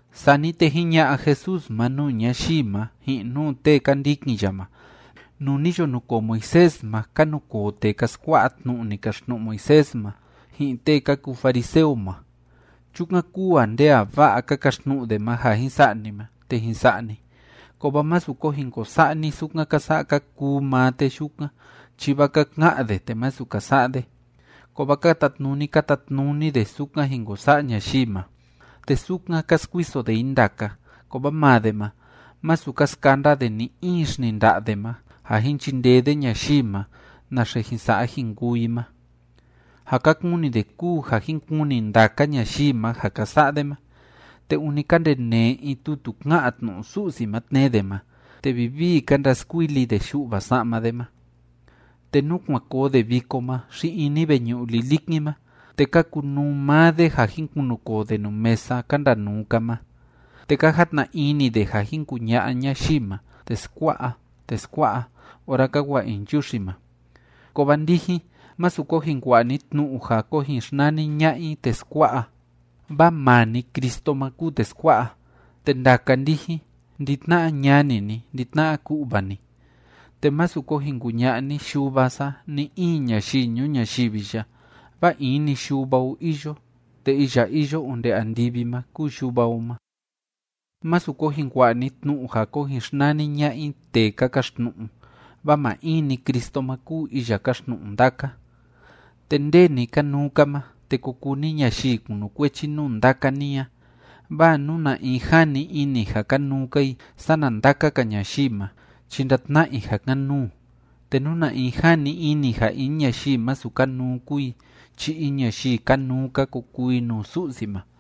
Sani te jiña'a Jesús ma nuu ñayii ma, ji'in nuu tee ka ndikin ya ma: ―Nuu ni yo nukoo Moisés ma, ka nukoo tee ka skua'a tnu'u ni kaxtnu'u Moisés ma, ji'in tee ka kuu fariseo ma. Chukan kúu ja nde a va'a ka kaxtnu'u de ma ja jin sa'a ni ma, te jin sa'a ni. Kovaa másu ko jin ko sa'a ni sukan ka sa'a ka kuu maa tee yukan, chi vaa ka ka'an de te masu ka sa'a de. Kovaa ka tatnuni ka tatnuni de sukan jin ko sa'a ñayii ma, te sukan ka skuiso de i ndaka, kovaa maa de ma, masu ka skanda de ni‑in xninda'a de ma ja jin chindee de ñayii ma naxe jin sa'a jin kuu i ma. Ja ka kuni de kúu ja jin kuni ndaka ñayii ma ja ka sa'a de ma, te ûni ka ndenee in tutu ká'an tnu'u Su'si ma tnee de ma, te vivii ka ndaskuili de yu'va sa'ma de ma. Te nú kuan koo de viko ma xi ini veñu'u lilikin ma, te ka kunuu maa de ja jin kunukoo de nuu mesa ka ndanuu‑ka ma. Te ka jatna ini de ja jin kuña'a ñayii ma: “Teskua'a, teskua'a”, ora ka wa'a i nchuxi ma. ’Kovaa ndijin, másu ko jin kua'a ni tnu'u ja ko jin xnani ña'a i teskua'a, vaa maa‑ni Cristo ma kúu teskua'a, te ndaka ndijin, ndi‑tna'a ñani ni, ndi‑tna'a ku'va ni. Te másu ko jin kuña'a ni yuva sa ni‑in ñayii ñuu ñayivi ya, vaa in‑ni Yuva o iyo, te iya iyo onde andivi ma kúu Yuva o ma. Másu ko jin kua'a ni tnu'u ja ko jin xnani ña'a i tee ka kaxtnu'u, vaa maa in‑ni Cristo ma kúu iya káxtnu'u ndaka. Te nde ni kanuu‑ka ma, te ko kuu ni ñayii kunukuechi nuu ndaka ni a. Vaa nú na in jani ini ja kanuu‑ka i sana ndaka‑ka ñayii ma chi ndatna'a i ja kan‑nuu. Te nú na in jani ini ja in ñayii masu kanuu kúu i chi in ñayii kanuu‑ka ko kuu i nuu Su'si ma.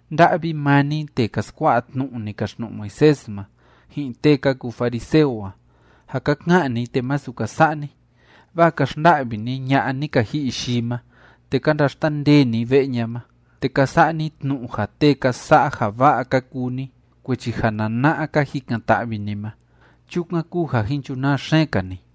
’¡Nda'vi maa ni tee ka skua'a tnu'u ni kaxtnu'u Moisés ma, ji'in tee ka kuu fariseo a, ja ka ka'an ni te masu ka sa'a ni! Vaa ka xnda'vi ni ña'a ni ka ji'i yii ma, te ka ndaxtandee ni ve'e ña ma, te ka sa'a ni tnu'u ja tee ka sa'a ja va'a ka kuu ni, kuechi ja nana'a ka jikan‑ta'vi ni ma. Chukan kúu ja jin chunaa xeen‑ka ni.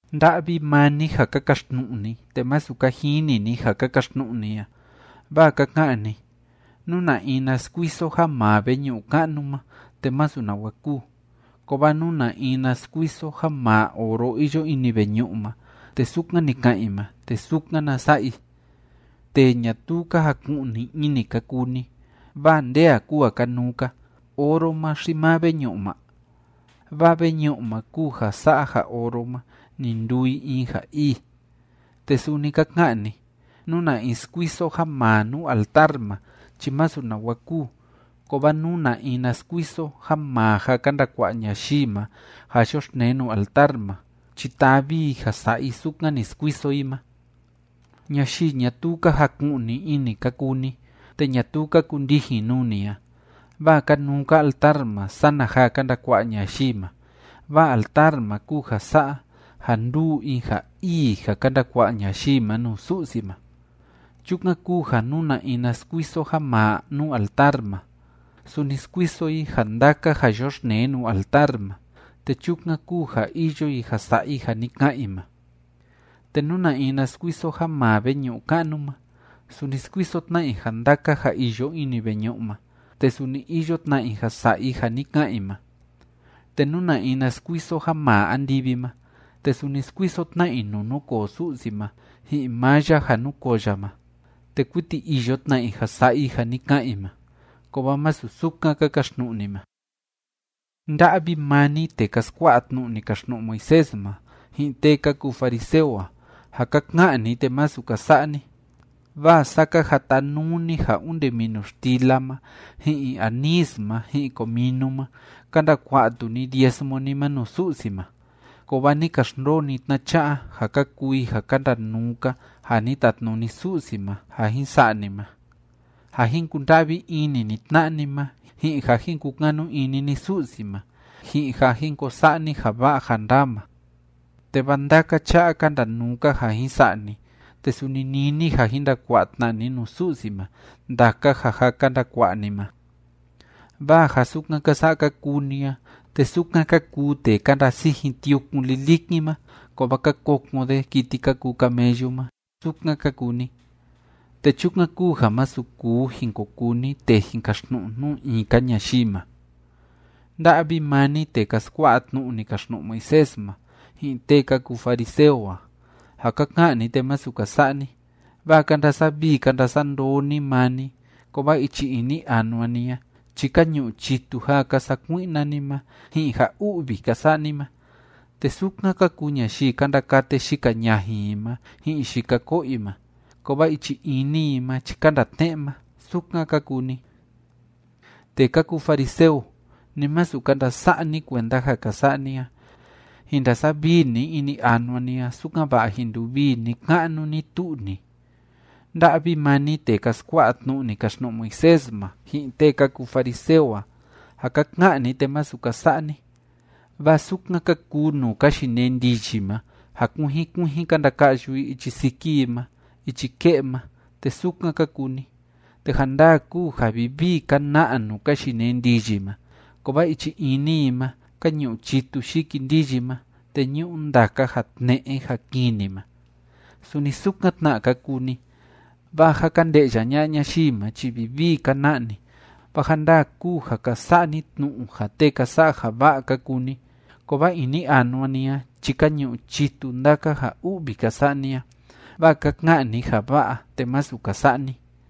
’¡Nda'vi maa ni ja ka kaxtnu'u ni, te masu ka jini ni ja ka kaxtnu'u ni a! Vaa ka ka'an ni: “Nú na in na skuiso ja maa veñu'u ka'nu ma, te masu nawa kúu, kovaa nú na in na skuiso ja maa oro iyo ini veñu'u ma, te sukan ni ka'an i ma, te sukan na sa'a i.” ¡Tee ñatuu ka jaku'ni ini ka kuu ni! Vaa ¿nde a kúu ja kanuu‑ka: oro ma xi maa veñu'u ma? Vaa veñu'u ma kúu ja sa'a ja oro ma, ni nduu i in ja ii. ’Te suni ka ka'an ni: “Nú na in skuiso ja maa nuu altar ma chi masu nawa kúu, kovaa nú na in na skuiso ja maa ja ka ndakua'a ñayii ma ja yoxtnee nuu altar ma chi tavi i ja sa'a i sukan ni skuiso i ma.” ¡Ñayii ñatuu ka jaku'ni ini ka kuu ni, te ñatuu ka kundijin nuu ni a! Vaa kanuu‑ka altar ma sana ja ka ndakua'a ñayii ma, vaa altar ma kúu ja sa'a ja nduu in ja ii ja ka ndakua'a ñayii ma nuu Su'si ma. ’Chukan kúu ja nú na in na skuiso ja maa nuu altar ma, suni skuiso i ja ndaka ja yoxtnee nuu altar ma, te chukan kúu ja iyo i ja sa'a i ja ni ka'an i ma. Te nú na in na skuiso ja maa veñu'u ka'nu ma, suni skuiso tna i ja ndaka ja iyo ini veñu'u ma, te suni iyo tna i ja sa'a i ja ni ka'an i ma. Te nú na in na skuiso ja maa andivi ma, te suni skuiso tna i nuu núkoo Su'si ma, ji'in maa ya ja núkoo ya ma, te kuiti iyo tna i ja sa'a i ja ni ka'an i ma. Kovaa masu sukan ka kaxtnu'u ni ma. ’¡Nda'vi maa ni tee ka skua'a tnu'u ni kaxtnu'u Moisés ma, ji'in tee ka kuu fariseo a, ja ka ka'an ni te masu ka sa'a ni! Vaa saa ka jatanuu ni ja onde minu xtila ma ji'in anís ma ji'in cominu ma ka ndakua'a tu ni diezmo ni ma nuu Su'si ma, kovaa ni ka xndoo ni tna'a cha'a ja ka kuu i ja ka ndanuu‑ka ja ni tatnuni Su'si ma ja jin sa'a ni ma, ja jin kunda'vi ini ni tna'a ni ma, ji'in ja jin kukanu ini ni Su'si ma, ji'in ja jin ko sa'a ni ja va'a ja ndaa ma. Te vaa ndaka cha'a ka ndanuu‑ka ja jin sa'a ni, te suni nini ja jin ndakua'a tna ni nuu Su'si ma ndaka ja jâ ka ndakua'a ni ma. ’Vaa ja sukan ka sa'a ka kuu ni a, te sukan ka kuu tee ka ndasijin tiukun lilikin ma kovaa ka kokon de kiti ka kuu camellu ma, sukan ka kuu ni. Te chukan kúu ja masu kuu jin ko kuu ni tee jin kaxtnu'u nuu in‑ka ñayii ma. ’¡Nda'vi maa ni tee ka skua'a tnu'u ni kaxtnu'u Moisés ma, ji'in tee ka kuu fariseo a, ja ka ka'an ni te masu ka sa'a ni! Vaa ka ndasavii ka ndasandoo ni maa ni, kovaa ichi ini anua ni a chi ka ñu'u chitu ja ka sakui'na ni ma ji'in ja u'vi ka sa'a ni ma. Te sukan ka kuu ñayii ka ndakate yika ñajin i ma ji'in yika ko'o i ma, kovaa ichi ini i ma chi ka ndaa tne'e ma, sukan ka kuu ni. Tee ka kuu fariseo, ni masu ka ndasa'a ni kuenda ja ka sa'a ni a. Jin ndasavii ni ini anua ni a, sukan‑va'a jin nduvii ni‑ka'nu ni‑tu'u ni. ’¡Nda'vi maa ni tee ka skua'a tnu'u ni kaxtnu'u Moisés ma, ji'in tee ka kuu fariseo a, ja ka ka'an ni te masu ka sa'a ni! Vaa sukan ka kuu nuu ka yinee ndiyi ma ja kuijin kuijin ka ndaka'yu i ichi siki i ma ichi ke'e ma, te sukan ka kuu ni. Te ja ndaa kúu ja vivii ka na'a nuu ka yinee ndiyi ma, kovaa ichi ini i ma ka ñu'u chitu yiki ndiyi ma, te ñu'u ndaka ja tne'e ja kini ma. Suni sukan tna ka kuu ni, vaa ja ka nde'ya ña'a ñayii ma chi vivii ka na'a ni, vaa ja ndaa kúu ja ka sa'a ni tnu'u ja tee ka sa'a ja va'a ka kuu ni, kovaa ini anua ni a chi ka ñu'u chitu ndaka ja u'vi ka sa'a ni a, vaa ka ka'an ni ja va'a te masu ka sa'a ni.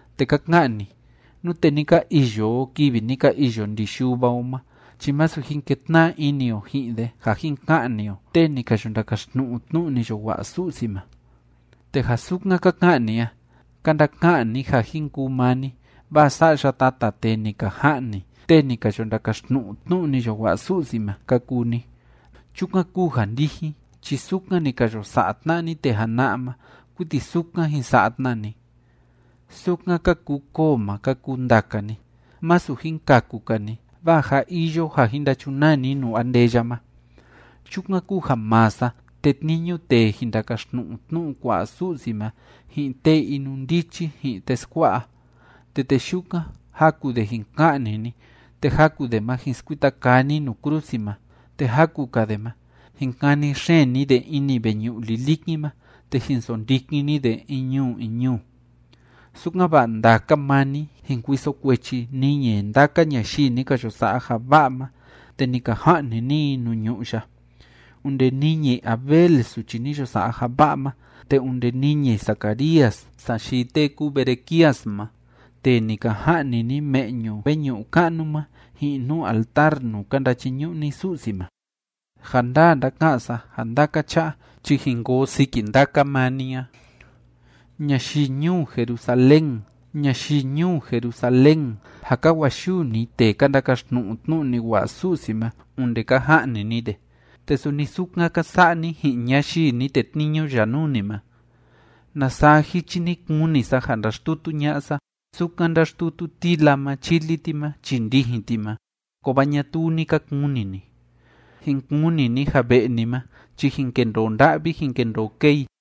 Te ka ka'an ni: “Nute ni ka iyo o kivi ni ka iyo ndi yuva o ma chi masu jin ketna'a ini o ji'in de ja jin ka'ni o tee ni ka yo ndakaxtnu'u tnu'u ni yo wa'a Su'si ma.” Te ja sukan ka ka'an ni a, ka ndaka'an ni ja jin kuu maa ni, vaa sa'ya tata tee ni ka ja'ni tee ni ka yo ndakaxtnu'u tnu'u ni yo wa'a Su'si ma ka kuu ni. ¡Chukan kúu ja ndijin chi sukan ni ka yo sa'a tna'a ni tee jana'a ma, kuiti sukan jin sa'a tna ni! ’¡Sukan ka kuu koo ma ka kuu ndaka ni! Masu jin kaku‑ka ni, vaa jâ iyo ja jin ndachunaa ni nuu andeya ma. Chukan kúu ja maa sa tetniñu tee jin ndakaxtnu'u tnu'u kua'a Su'si ma ji'in tee inundichi ji'in teskua'a. Te tee yukan, jaku de jin ka'ni ni, te jaku de ma jin skuita kaa ni nuu krusi ma, te jaku‑ka de ma, jin kani xeen ni de ini veñu'u lilikin ma, te jin sondikin ni de in ñuu in ñuu. Sukan‑va'a ndaka maa ni jin kuiso kuechi niñi ndaka ñayii ni ka yo sa'a ja va'a ma te ni ka ja'ni ni i nuu ñu'ú ya, onde niñi Abel suchi ni yo sa'a ja va'a ma, te onde niñi Zacarías sayii tee kúu Berequías ma tee ni ka ja'ni ni me'ñu veñu'u ka'nu ma ji'in nuu altar nuu ka ndachiñu'u ni Su'si ma. Ja ndaa ndáka'an sa ja ndaka cha'a jin koo siki ndaka maa ni a. ’¡Ñayii ñuu Jerusalén, ñayii ñuu Jerusalén, ja ka wa'a‑yuu ni tee ka ndakaxtnu'u tnu'u ni wa'a Su'si ma onde ka ja'ni ni de! ¡Te suni sukan ka sa'a ni ji'in ñayii ni tetniñu ya nuu ni ma! ¡Na saa jichi ni kuni sa ja ndaxtutu ña'a sa, sukan ndáxtutu tila ma chili ti ma chii ndijin ti ma! Kovaa ñatuu ni ka kuni ni. Jin kuni ni ja ve'e ni ma chi jin kendoo nda'vi jin kendoo kee i.